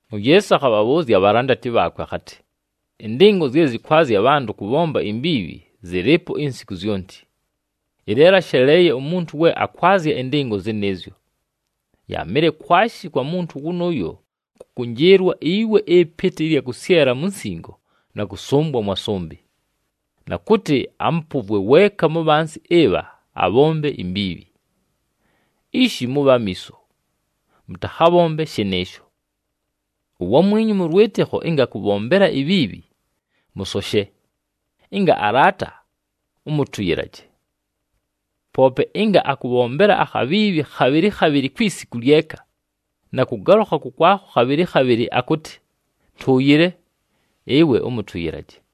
UYeesu akhabhabhʉʉzya abhalandati bhaakwe akhatɨ, “Ɨndɨngo zye zɨkwazya abhantʉ kʉbhomba imbiibhi zɨlɨɨpo insiku zyonti. Ɨleelo, asheleeye umuntu we akwazya ɨndɨngo zɨnɨɨzyo! Yaamɨle kwashi kwa muntu wʉnʉʉyo kʉkʉnjɨɨlwa iwe ɨpɨtɨ ɨlya kʉsyela mu nsingo na kʉsʉmbwa mwa sʉmbɨ, na kʉtɨ amʉpʉvwe weeka mu bhansi ɨbha abhombe imbiibhi! Ishi, mʉbhe amiiso, mʉtakhabhombe shɨnɨɨsho! “Uwamwinyu mʉ lwɨtɨkho ɨnga akʉbhombela ibhiibhi, mʉsoshe, ɨnga alaata, ʉmʉtʉyɨlaje. Poope ɨnga akʉbhombela akhabhiibhi khabhɨlɨ khabhɨlɨ kwi siku lyeka, na kʉgalʉkha kʉkwakho khabhɨlɨ khabhɨlɨ akʉtɨ, ‘Ntʉʉyɨle,’ ɨwe ʉmʉtʉyɨlaje.”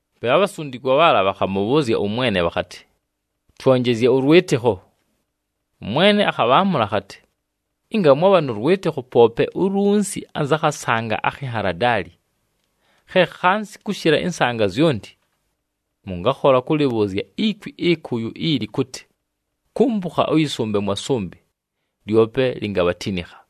Pe abhasundikwa bhaala bhakhamʉbhʉʉzya ʉMwene bhakhatɨ, “Twonjezye ʉlwɨtɨkho!” ɄMwene akhabhaamʉla akhatɨ, “Ɨnga mwabha nʉ lwɨtɨkho, poope ulunsi anza khasanga akhi nhaladaali, khe khansi kʉshɨla ɨnsanga zyonti, mʉngakhola kʉlɨbhʉʉzya ikwi ɨkʉyʉ ili kʉtɨ, ‘Kumpukha ʉyɨsʉmbe mwa sʉmbɨ,’ lyope lingabhatinikha!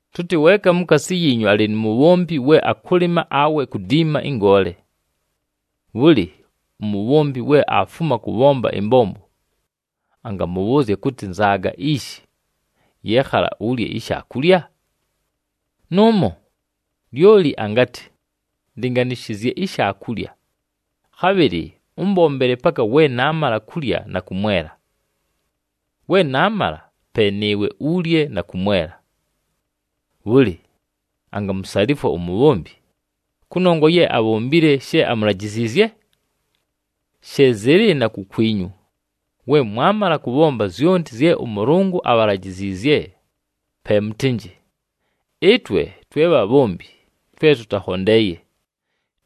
“Tʉtɨ weeka mukaasi yiinyu alɨ nu mubhombi we akʉlɨma awe kudiima ɨngoole. Bhʉlɨ, umubhombi we aafuma kʉbhomba ɨmbombo, angamʉbhʉʉzya kʉtɨ, ‘Nzaaga ishi, yɨɨkhala ulye ishaakulya’? Nʉʉmo! Lyoli angatɨ, ‘Ndɨnganɨshɨzye ishaakulya, khabhɨlɨ ʉmbombele paka we naamala kulya na kʉmwela. We naamala, pe nɨɨwe ulye na kʉmwela.’ Bhʉlɨ, angamusalifwa umubhombi, kʉnongwa ye abhombile she amulajiziizye? She zɨlɨ na kukwinyu, we mwamala kʉbhomba zyonti zye ʉMʉlʉngʉ abhalajiziizye, pe mʉtɨnjɨ, ‘Ɨtwe twe bhabhombi twe tʉtakhondeeye,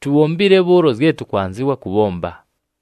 tubhombile bhʉʉlo zye tʉkwanzɨwa kʉbhomba.’”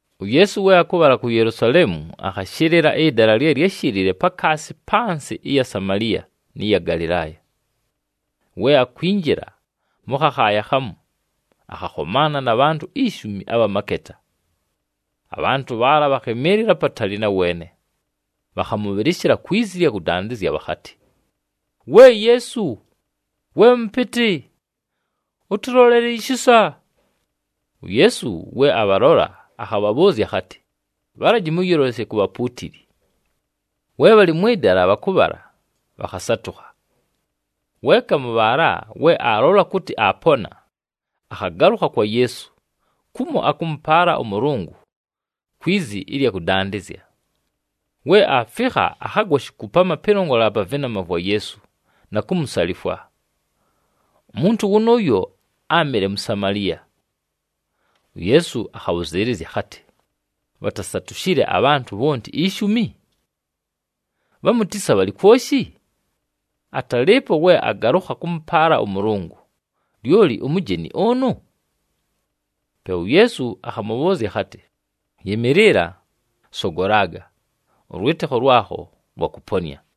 UYeesu we akʉbhala ku Yelusaleemu, akhashɨlɨla ɨdala lye lyáshɨlɨɨye pakaasi pa nsɨ ɨya Samaliya nɨ ya Galɨlaaya. We akwinjila mʉ khakhaaya khamu, akhakhomaana na bhantʉ ishumi abha maketa. Abhantʉ bhaala bhakhɨmɨɨlɨla apatali na weene, bhakhamʉbhɨlɨshɨla kwi zi bhakhatɨ, “We Yeesu, we Mʉpɨtɨ, ʉtʉlolele ishisa!” UYeesu we abhalola, akhabhabhʉʉzya akhatɨ, “Bhalaji mʉyɨlolesye ku bhapuutili.” We bhalɨ mwɨ dala bhakʉbhala, bhakhasatʉkha. Weeka mʉ bhaala, we aalola kʉtɨ aapona, akhagalʉkha kwa Yeesu, kumo akʉmʉpaala ʉMʉlʉngʉ kwi zi ɨlya kʉdandɨzya. We aafikha, akhagwa shikupama pɨlongolela pa vɨnama vwa Yeesu na kumusalifwa. Umuntu wʉnʉʉyo, áamɨle Musamaliya. UYeesu akhabhʉzɨɨlɨzya akhatɨ, “Bhatasatushile abhantʉ bhonti ishumi? Bhamu tisa bhalɨ kwoshi? Atalɨɨpo we agalʉkha kʉmʉpaala ʉMʉlʉngʉ, lyoli umujeni ʉnʉ?” Pe uYeesu akhamʉbhʉʉzya akhatɨ, “Yɨmɨɨlɨla, sogolaga, ʉlwɨtɨkho lwakho lwakʉponɨa!”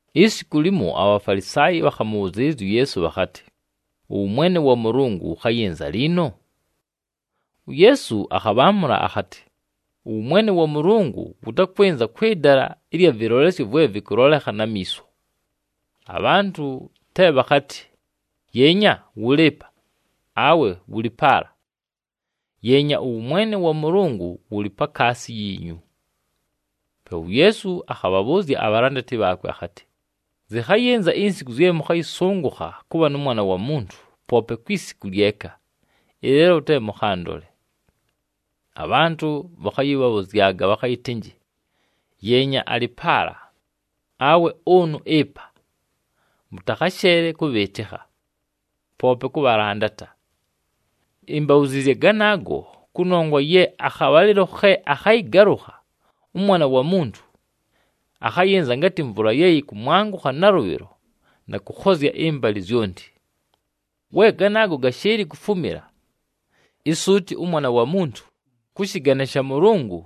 Isiku limo, aBhafalisaayi bhakhamʉbhʉzɨɨlɨzya uYeesu bhakhatɨ, “Ʉwʉmwene wa Mʉlʉngʉ wʉkhayɨnza liino?” UYeesu akhabhaamʉla akhatɨ, “Ʉwʉmwene wa Mʉlʉngʉ wʉtakwɨnza kwɨ dala ɨlya vɨlolesyo vwe vɨkʉlolekha na miiso. Abhantʉ te bhakhatɨ, ‘Yeenya! Wʉlɨ ɨpa!’ Awe ‘Wʉlɨ paala!’ Yeenya, ʉwʉmwene wa Mʉlʉngʉ wʉlɨ pakaasi yiinyu.” Pe uYeesu akhabhabhʉʉzya abhalandati bhaakwe akhatɨ, “Zɨkhayɨnza insiku zye mʉkhayɨsʉngʉkha kʉbha nʉ Mwana wa Muntu poope kwi siku lyeka, ɨleelo te mʉkhandole. Abhantʉ bhakhayɨbhabhʉzyaga bhakhayɨtɨnjɨ, ‘Yeenya! Alɨ paala!’ Awe ‘Ʉnʉ ɨpa!’ Mʉtakhasheele kʉbhɨɨtɨkha, poope kʉbhalandata. Imbabhuziizye ganaago, kʉnongwa ye akhabhalɨlo khe akhayɨgalʉkha ʉMwana wa Muntu, akhayɨnza ngatɨ mvula ye yɨkʉmwangʉkha nalʉbhɨlo na kʉkhozya ɨmbalɨ zyonti. We ganaago gashɨɨlɨ kufumila, isuuti ʉMwana wa Muntu, kʉ shɨgane sha Mʉlʉngʉ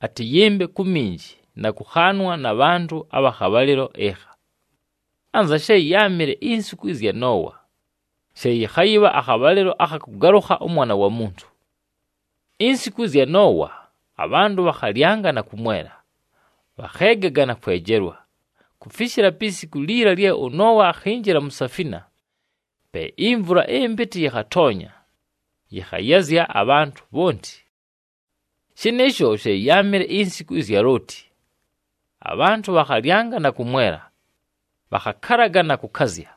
atɨyɨmbe ku minji na kʉkhaanwa na bhantʉ abha khabhalɨlo ɨkha. “Anza she yáamɨle insiku ɨzya Noowa, she yɨkhayɨbha akhabhalɨlo akha kʉgalʉkha ʉMwana wa Muntu. Insiku ɨzya Noowa, abhantʉ bhakhalyanga na kʉmwela, bhakheegaga na kwejelwa, kufishila pi siku liila lye ʉNoowa akhinjila mu safina. Pe imvula ɨmpɨtɨ yɨkhatoonya, yɨkhayazya abhantʉ bhonti. “Shɨnɨɨsho she yáamɨle insiku ɨzya Looti. Abhantʉ bhakhalyanga na kʉmwela, bhakhakalaga na kʉkazya,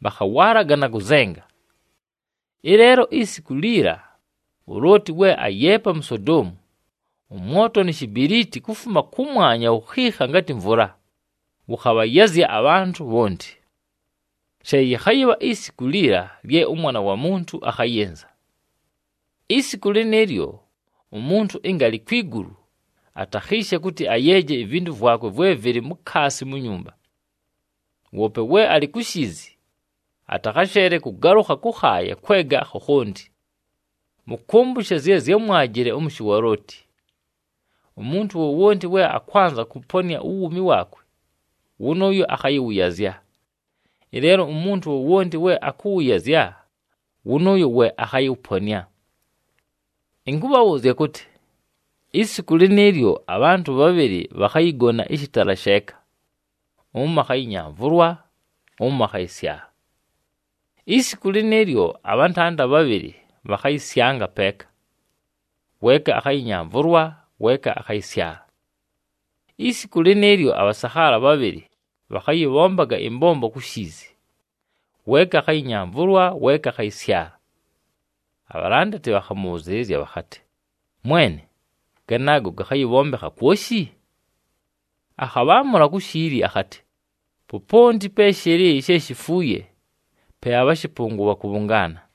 bhakhawaalaga na kʉzenga. Ɨleelo isiku liila uLooti we ayeepa mu Sodoomu, ʉmwoto ni shibiliiti kufuma kʉmwanya wukhiikha ngatɨ mvula, wʉkhabhayazya abhantʉ bhonti. She yɨkhayɨbha isiku liila, lye ʉMwana wa Muntu akhayɨnza. “Isiku lɨnɨɨlyo, umuntu ɨnga alɨ kwi gulu, atakhiishe kʉtɨ ayeeje ivintu vwakwe vwe vɨlɨ mukaasi mu nyumba. Woope we alɨ ku shiizi, atakhasheele kʉgalʉkha kʉkhaaya kwega khakhonti. Mʉkʉmbʉshe zye zyámwajile ʉmʉshɨ wa Looti. Umuntu wowonti we akwanza kʉponɨa uwuumi waakwe, wʉnʉʉyo akhayɨwʉyazya. Ɨleelo umuntu wowonti we akʉwʉyazya, wʉnʉʉyo we akhayɨwʉponɨa. “Ɨnkʉbhabhʉʉzya kʉtɨ, isiku lɨnɨɨlyo abhantʉ bhabhɨlɨ bhakhayɨgona ɨshɨtala sheeka, ʉmo akhayɨnyamvʉlwa, ʉmo akhayɨsyala. Isiku lɨnɨɨlyo, abhantanda bhabhɨlɨ bhakhayɨsyanga peeka, weeka akhayɨnyamvʉlwa, weeka akhayɨsyala. [ Isiku lɨnɨɨlyo, abhasakhaala bhabhɨlɨ bhakhayɨbhombaga ɨmbombo ku shiizi, weeka akhayɨnyamvʉlwa, weeka akhayɨsyala.]” Abhalandati bhakhamʉbhʉzɨɨlɨzya bhakhatɨ, “Mwene, ganaago gakhayɨbhombekha kwoshi?” Akhabhaamʉla ku shiili akhatɨ, “Poponti pe shɨlɨ she shifuuye, pe abhashɨpʉngʉ bhakʉbhʉngaana.”